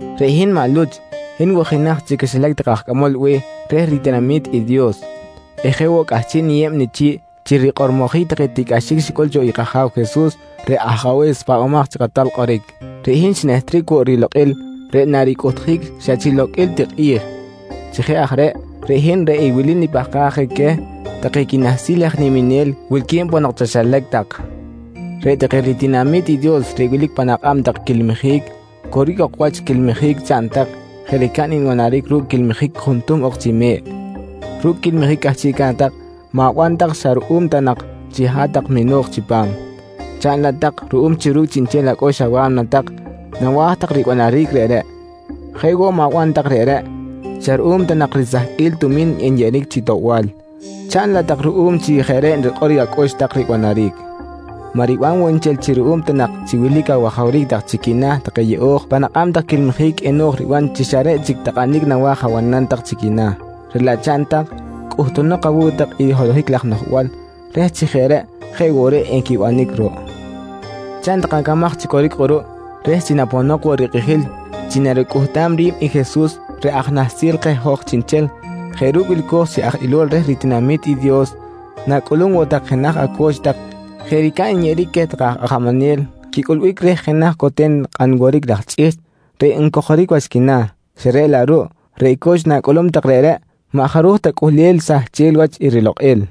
Reꞌ hin maꞌ Luch, hin woꞌ jenaj chi quixilac take aj cꞌamol be̱h reh ritinami̱t i Dios eh jeꞌ woꞌ cꞌahchiꞌ niyeb nichi̱ꞌ chi rikꞌormojic take tiꞌcꞌaxic xicꞌul cho i kAja̱w Jesus reꞌ Ajabe̱s Pahbamaj chi Kꞌatal Kꞌoric. Reꞌ hin xinehtric woꞌ rilokꞌil reꞌ naricꞌuhtjic xa chi loqꞌuil ti kꞌi̱j. Chi jeꞌ aj reꞌ, reꞌ hin reꞌ i wili nipahkaj je queh take quinahsil aj niminel wilque̱b ponok chaxilac tak: Reꞌ take ritinami̱t i Dios reꞌ wilic pan akꞌab tak quilmijic, coric ok wach quilmijic chaꞌn tak jeꞌ ricab nbanaric ru̱cꞌ quilmijic juntuhm ok chi me̱ꞌ. Ru̱cꞌ quilmijic cꞌahchiꞌca̱t tak, ma̱ban tak xa ruꞌum ta nak chi hat-tak mino̱j chipam, chaꞌn laꞌ tak ruꞌum chi ru̱cꞌ chiꞌnchel acꞌux awa̱mna tak nawa̱j tak ribanaric reꞌreꞌ. Jeꞌ woꞌ ma̱ban tak reꞌreꞌ xa ruꞌum ta nak risahqꞌuil tumi̱n nyeꞌeric chi toꞌbal, chaꞌn laꞌ tak ruꞌum chi jeꞌ reꞌ rikꞌor acꞌux tak ribanaric. Maꞌ riban woꞌ nchel chi ruꞌum ta nak chi wilic awajawric tak chi quina̱ take yeꞌo̱j pan akꞌab tak quilmijic eno̱j riban chi xa reꞌ chic takꞌanic nawa̱j abanam tak chi quina̱. Reꞌ laꞌ chaꞌn tak, cꞌuhtunok awu̱cꞌ tak i holohic laj noꞌjbal reh chi jeꞌ reꞌ jeꞌ woꞌ reꞌ equibanic ruꞌ. Chaꞌn tak acamaj chi coric kꞌuruꞌ reh chi naponok woꞌ i rikꞌijil chi naricꞌuhtam ri̱b i Jesus reꞌ Aj Nahsil keh hoj chiꞌnchel jeꞌ ru̱cꞌ wilco̱j chi aj ilol reh ritinami̱t i Dios na̱cꞌulum woꞌ tak jenaj aco̱ch tak jeꞌ ricab nyeꞌeric queh take aj ajamanel quicꞌulbic reh jenaj coten kꞌan woric laj chꞌihchꞌ reꞌ ncojoric wach quina̱. Xa reꞌ laꞌ ruꞌ reꞌ co̱ch na̱cꞌulum tak reꞌreꞌ maꞌ jaruj cꞌuhlel sahchel wach i rilokꞌil.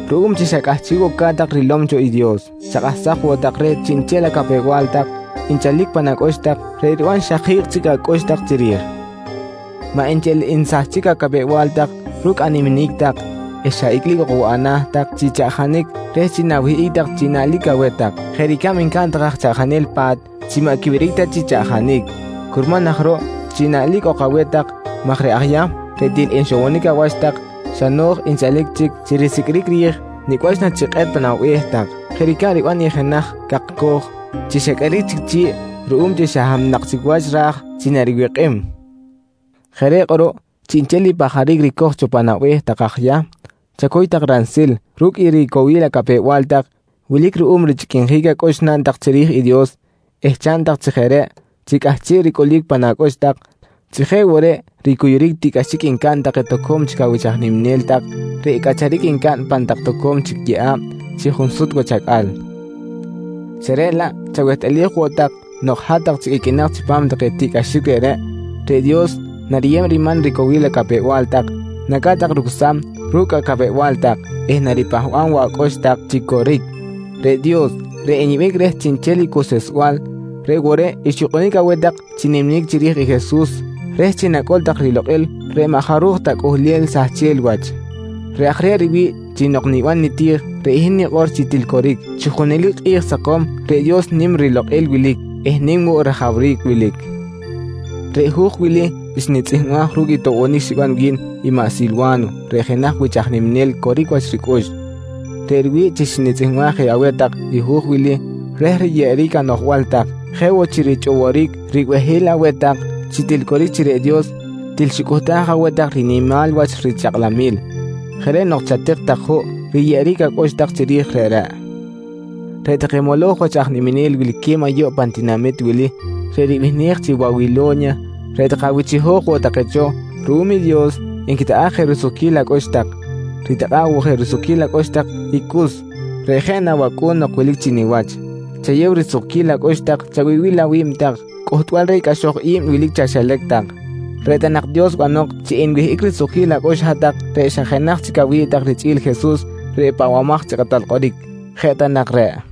Ruꞌum chi xa cꞌahchiꞌ woꞌ ca̱t tak rilom cho i Dios, chakꞌahsaj woꞌ tak reh chiꞌnchel acapew-bal tak nchalic pan acꞌux tak reꞌ riban xa ji̱kꞌ chic acꞌux tak chiri̱j. Maꞌ nchel nsahchic acapew-bal tak ru̱cꞌ animinic tak eh xa icꞌlic ok woꞌ ana̱ tak chi chaꞌjanic reh chi na̱wihꞌic tak chi naꞌlic aweh tak, jeꞌ ricab ncaꞌn reꞌ take aj chaꞌjanel pa̱t chi maꞌ quiwiric ta chi chaꞌjanic. Curman aj ruꞌ chi naꞌlic ok aweh tak maj reꞌ aj Yahm reꞌ til nxowonic awach tak, xa no̱j nchalic chic chi risiqꞌuiric ri̱j nicꞌ wach na chikꞌet pa̱m abe̱h tak, jeꞌ ricab riban i jenaj cakcoj chi xa qꞌueric chic chi̱ꞌ ruꞌum chi xa hab nak chic wach ra̱j chi naribikꞌim. Jeꞌ reꞌ kꞌuruꞌ chiꞌnchel i pajaric ricoj pan abe̱h tak aj Yahm, chacuy tak ransil ru̱cꞌ i ricowil acapew-bal tak wilic ruꞌum richꞌiquinjic acꞌux naꞌn tak chiri̱j i Dios eh chaꞌn tak chi jeꞌ reꞌ chi cꞌahchiꞌ ricꞌulic pan acꞌux tak chi jeꞌ woꞌ reꞌ ricuyuric tiꞌcꞌaxic ncaꞌn take toco̱m awich aj niminel tak reꞌ cꞌacharic ncaꞌn pan tak toco̱m chic yeꞌa̱b chi junsut wach acꞌal. Xa reꞌ laꞌ chawehtꞌalij woꞌ tak nok hat-tak chic iqꞌuinak chipam take tiꞌcꞌaxic reꞌreꞌ, reꞌ Dios nariyeb riman ricowil acapew-bal tak, naca̱t tak rucsam ru̱cꞌ acapew-bal tak eh naripahba̱b woꞌ acꞌux tak chi coric. Reꞌ Dios reꞌ nyeꞌbic reh chiꞌnchel i cuseꞌsbal reꞌ woꞌ reꞌ xyukꞌunic aweh tak chi niminic chiri̱j i Jesus reh chi enacꞌul tak rilokꞌil reꞌ maꞌ jaruj ta cꞌuhlel sahchel wach. Reꞌ aj reꞌ riwi̱ꞌ chi nok niban niti̱j reꞌ hin nikꞌor chi til coric, chi junelic kꞌi̱j sakom reꞌ Dios nim rilokꞌil wilic eh nim woꞌ rajawric wilic. Reꞌ hu̱j wili xnitzꞌihmbaj ru̱cꞌ i toꞌbonic xiban wi̱n i maꞌ Silwa̱no reꞌ jenaj wich aj niminel coric wach ricꞌux. Reꞌ riwi̱ꞌ chi xnitzꞌihmbaj je aweh tak i hu̱j wili reh riyeꞌeric anoꞌjbal tak jeꞌ woꞌ chi richꞌoboric ribehil aweh tak chi til coric chi reꞌ Dios til xicꞌuhtaj aweh tak rinimal wach richakꞌlamil. Jeꞌ reꞌ nok chatik tak juꞌ riyeꞌeric acꞌux tak chiri̱j reꞌreꞌ. Reꞌ take moloj wach aj niminel wilque̱b ayuꞌ pan tinamit wili reꞌ ribihnej chi “Wawilo̱nya”, reꞌ take awich chiho̱j woꞌ take cho ruꞌum i Dios, nquitakꞌa̱ꞌ je risukquil acꞌux tak. Ritakꞌa̱ꞌ woꞌ je risukquil acꞌux tak i Cus, reꞌ jeꞌ na wacꞌu̱n nok wilic chi niwach. Chayew risukquil acꞌux tak chawibil awi̱b tak cꞌuhtbal reh i cꞌaxoj i̱b wilic chaxilac tak. Reꞌ ta nak Dios banok chi enwihꞌic risukquil acꞌux hat-tak reꞌ xa jenaj chic awi̱ꞌ tak richꞌi̱l Jesus reꞌ Pahbamaj chi Kꞌatal Kꞌoric. Jeꞌ ta nak reꞌ.